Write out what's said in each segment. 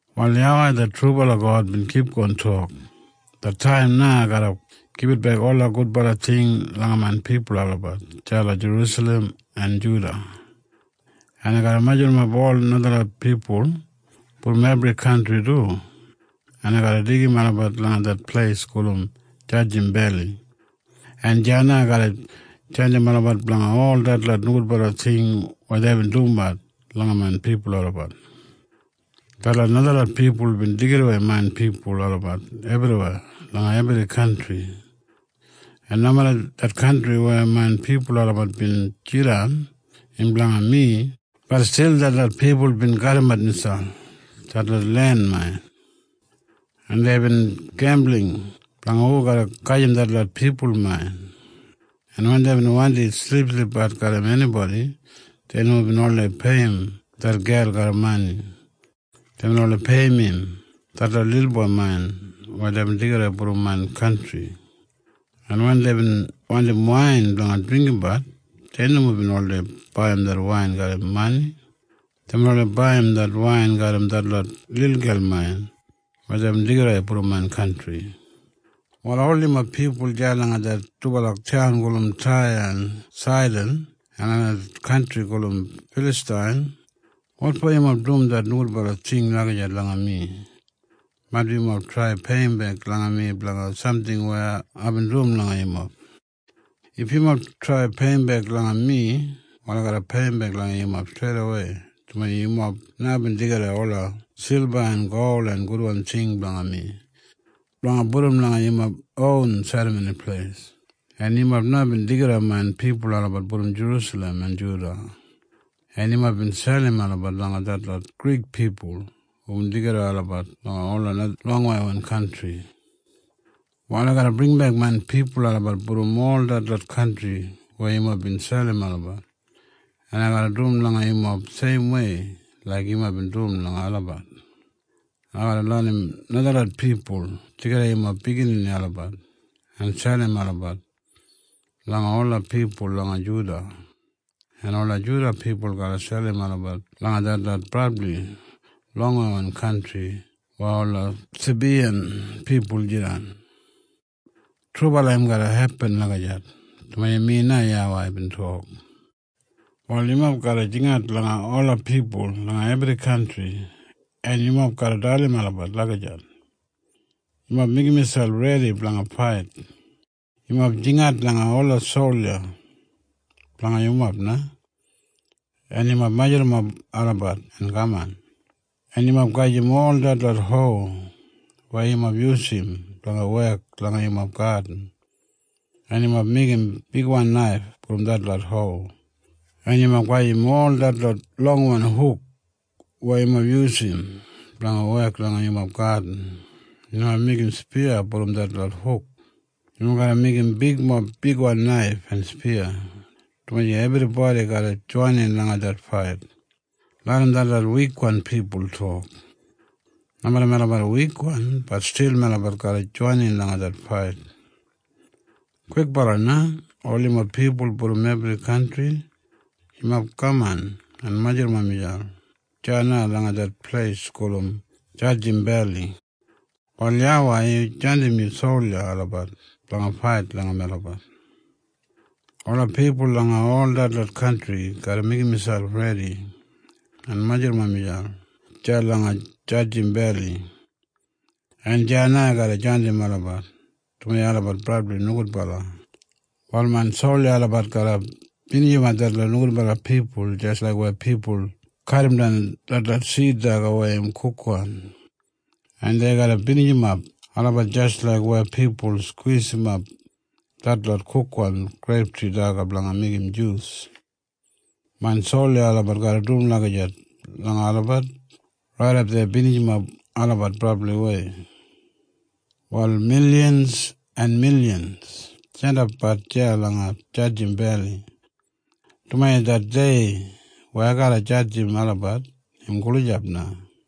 Wal YAWEI det trubala God bin kipgon tok, “Det taim na ai garra gibitbek ola gudbala ting langa main pipul olabat deya langa Jerusalem en Juda. En ai garra majurrumap ola najalot pipul brom ebri kantri du, en ai garra deigim olabat langa det pleis gulum Jadjim Beli, en deya na ai garra jadjim olabat blanga ol detlot nogudbala ting weya deibin dumbat langa main pipul olabat. “Detlot najalot pipul bin deigidawei main pipul olabat ebriweya langa ebri kantri. En nomeda det kantri weya main pipul olabat bin jidan im blanga mi, bat stil detlot pipul bin kadimat miselp detlot len main. En deibin gembuling blanga hu garra gajim detlot pipul main. En wen deibin wandi silipsilipbat garram enibodi, dei nomo bin oldei peiyim det gel garram mani. Deibin oldei peiyim im detlot lilboi main weya deibin deigidawei brom main kantri. En wen deibin wandim wain blanga dringgimbat, dei nomo bin oldei baiyim det wain garram mani. Deibin oldei baiyim det wain garram detlot lilgel main weya deibin deigidawei brom main kantri. “Wal ol yumob pipul deya langa det dubala taun gulum Taya en Saidan en langa det kantri gulum Filastain, wotfo yumob dum det nogudbala ting lagijat langa mi? Maitbi yumob trai peiyimbek langa mi blanga samting weya aibin dum langa yumob. “If yumob trai peiyimbek langa mi, wal ai garra peiyimbek langa yumob streidawei, dumaji yumob na bin deigidawei ola silba en gol en gudwan ting blanga mi blanga pudum langa yumob ron serramoni pleis. En yumob na bin deigidawei main pipul olabat brom Jerusalem en Juda, en yumob bin selim olabat langa detlot Grik pipul hubin deigidawei olabat langa ola longweiwan kantri. “Wal ai garra bringimbek main pipul olabat brom ol detlot kantri weya yumob bin selim olabat, en ai garra dum langa yumob seimwei laik yumob bin dum langa olabat. Ai garra larram najalot pipul deigidawei yumob biginini olabat en selim olabat langa ola pipul langa Juda, en ola Juda pipul garra selim olabat langa detlot brabli longweiwan kantri weya ola Sabiyan pipul jidan. Trubala im garra hepin lagijat, dumaji mi na YAWEI bin tok. “Wal yumob garra jingat langa ola pipul langa ebri kantri, en yumob garra dalim olabat lagijat, Yumob meigim miselp redi blanga fait. Yumob jingat langa ola solja blanga yumob na, en yumob majurrumap olabat en kaman. En yumob gajim ol detlot ho weya yumob yusum blanga wek langa yumob gadin, en yumob meigim bigwan naif brom detlot ho. En yumob gajim ol detlot longwan huk weya yumob yusum blanga wek langa yumob gadin, en yumob meigim spiya brom detlot huk. Yumob garra meigim bigmob bigwan naif en spiya, dumaji ebribodi garra joinin langa det fait. Larram detlot wikwan pipul tok, ‘Nomeda melabat wikwan, bat stil melabat garra joinin langa det fait.’ Kwikbala na ol yumob pipul brom ebri kantri, yumob kaman en majurrumap miselp deya na langa det pleis gulum Jadjim Beli. Wal YAWEI yu jandim yu solja olabat blanga fait blanga melabat. “Ola pipul langa ol detlot kantri garra meigim miselp redi, en dei garra majurrumap miselp deya langa Jadjim Beli, en deya na ai garra jadjim olabat, dumaji olabat brabli nogudbala. “Wal main solja olabat garra binijimap detlot nogudbala pipul jis laik weya pipul kadimdan detlot sid daga weya im kukwan, en dei garra binijimap olabat jis laik weya pipul skwisimap detlot kukwan greiptri daga blanga meigim jus. Main solja olabat garra dum lagijat langa olabat raidap dei binijimap olabat brabliwei. “Wal milyans en milyans jandapbat deya langa Jadjim Beli, dumaji det dei weya ai garra jadjim olabat im gulijap na.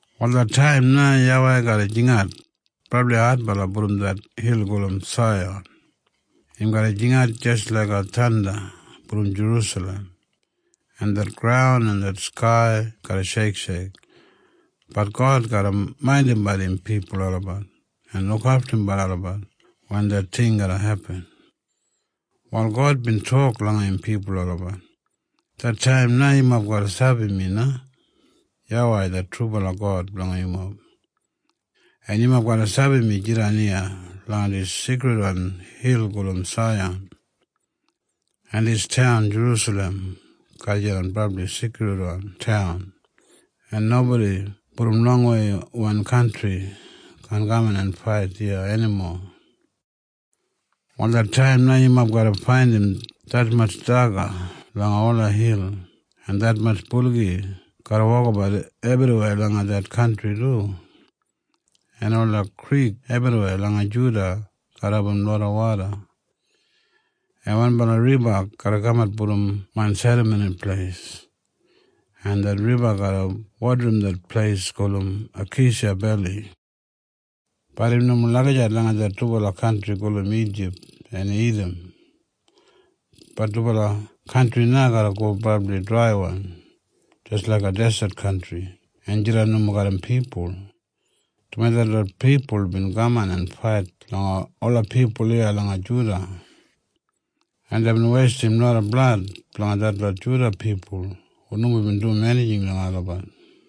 Wal det taim na YAWEI garra jingat brabli adbala brom det hil gulum Saiyan. Im garra jingat jis laiga thanda brom Jerusalem, en det graun en det skai garra sheiksheik. Bat God garra maindimbat im pipul olabat en lukaftumbat olabat wen det ting garra hepin. Wal God bin tok langa im pipul olabat, “Det taim na yumob garra sabi mi na YAWEI det trubala God blanga yumob. En yumob garra sabi mi jidan iya langa dis seikridwan hil gulum Saiyan. En dis taun Jerusalem garra jidan brabli seikridwan taun, en nobodi brom longweiwan kantri kaan kaman en fait iya enimo. “Wal det taim na yumob garra faindim detmatj daga langa ola hil. En detmatj buligi garra wokabat ebriweya langa det kantri du. En ola krik ebriweya langa Juda garra abum loda woda. En wanbala riba garra kamat brom main Serramoni Pleis, en det riba garra wodarim det pleis gulum Akeisha Beli. “Bat im nomo lagijat langa det dubala kantri gulum Ijip en Idam. Det dubala kantri na garra go brabli draiwan jis laiga deset kantri en jidan nomo garram pipul, dumaji detlot pipul bin kaman en fait langa ola pipul iya langa Juda, en deibin weistim loda blad blanga detlot Juda pipul hu nomo bin dum enijing langa olabat.